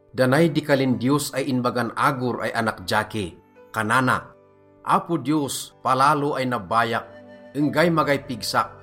Da nay di kalin Diyos ay inbagan Agur ay anak Jakeh. Kanana: Apo Diyos, palalo ay nabbayak, enggay magay pigsak.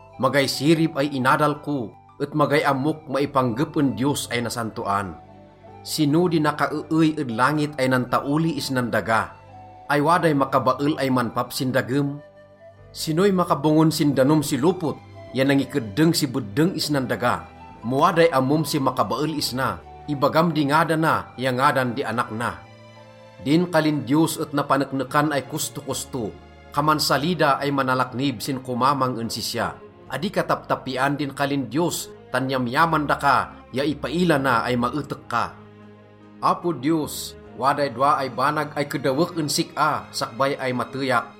Magay sirib ay inadal ko et magay ammok maipanggep en Diyos ay Nasantoan. Sino di nakaeey ed langit ay nantaoli isnan daga? Ay waday makabael ay manpap sin dagem? Sinoy makabongon sin danom si lopot ya nangikeddeng si beddeng isnan daga? Mo waday ammom si makabael isna, ibagam di ngadana ya ngadan di anak na. Din kalin Diyos et napaneknekan ay kostokosto. Kaman salida ay manalaknib sin komamang en sisya. Adi ka taptapian din kalin Diyos tan yamyaman daka ya ipaila na ay maetek ka. Apo Diyos, waday dowa ay banag ay kedawek en sik-a sakbay ay mateyak: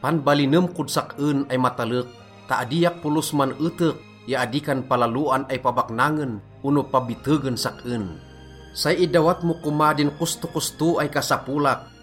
Panbalinem kod sak-en ay matalek ta adiak polos man-etek ya adi kan palaloan ay pabaknangen ono pabitegen sak-en. Say idawat mo koma din kostokosto ay kasapolak,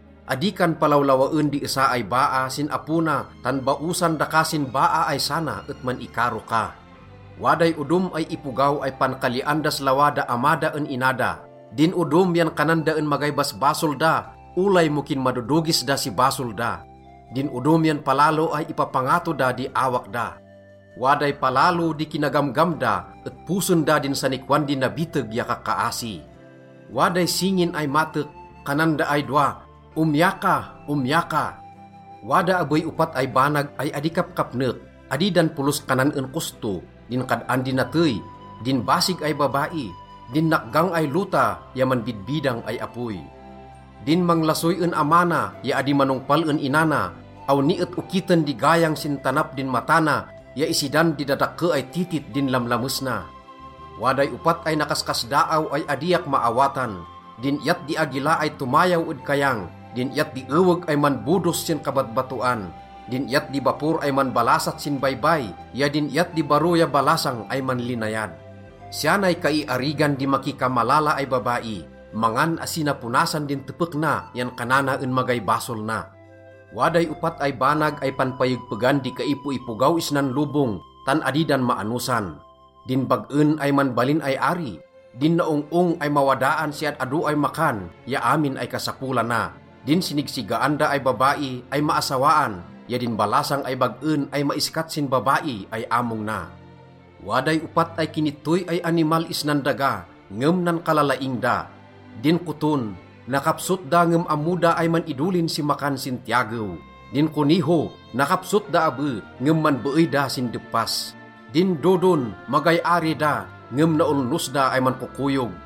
Adi kan palawlawaen di esa ay baa sin apo na tan baosan daka sin baa ay sana et man-ikaro ka. Waday odom ay ipogaw ay pankalian das lawa da ama da en ina da. Din odom yan kanan da en magay basbasol da olay mo kinmadodogis da si basol da. Din odom yan palalo ay ipapangato da di awak da. Waday palalo di kinagamgam da et posen da din sanikwan di nabiteg ya kakkaasi. Waday singin ay matek. Kanan da ay dowa, “Omya ka, omya ka.” Wada abey opat ay banag ay adi kapkapnek, adi dan polos kanan en kosto: din kad-an di natey, din basig ay babai, din nakgang ay lota ya manbidbidang ay apoy. Din manglasoy en ama na ya adi manongpal en ina na, awni et okiten di gayang sin tanap din mata na ya isidan di dadakke ay titit din lamlames na. Waday opat ay nakaskasdaaw ay adiak maawatan: din iyat di agila ay tomayaw ed kayang, din iyat di eweg ay manbodos sin kabatbatoan, din iyat di bapor ay manbalasat sin baybay ya din iyat di baro ya balasang ay manlinayad. Siya nay kaiarigan di makikamalala ay babai: mangan asi na ponasan din tepek na yan kanana en magay basol na. Waday opat ay banag ay panpayegpegan di kaipoipogaw isnan lobong, tan adi dan maanosan: din bag-en ay manbalin ay ari, din naong-ong ay mawadaan si ad-ado ay makan ya amin ay kasapolana, din sinigsigaan da ay babai ay maasawaan ya din balasang ay bag-en ay maiskat sin babai ay among na. Waday opat ay kinittoy ay animal isnan daga, ngem nankalalaing da: Din koton, nakapsot da ngem ammo da ay man-idolin si makan sin tiyagew. Din koneho, nakapsot da abe, ngem manbeey da sin deppas. Din dodon, magay ari da, ngem naolnos da ay mankokoyog.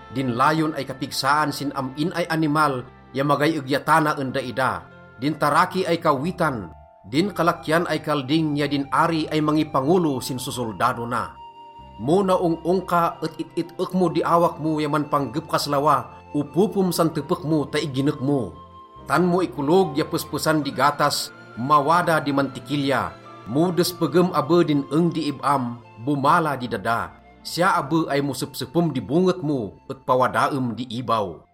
din layon ay kapigsaan sin am-in ay animal ya magay egyatana en daida, din taraki ay kawwitan, din kalakian ay kalding ya din ari ay mangipangolo sin sosoldado na. Mo naong-ong ka et it-it-ek mo di awak mo ya manpanggep kas lawa, opopem san tepek mo ta iginek mo. Tan mo ikolog ya pespesan di gatas, mawada di mantikilya. Mo despegem abe din eng di ib-am, bomala di dada. Siya abe ay mo sepsepem di bonget mo et pawadaem di ibaw.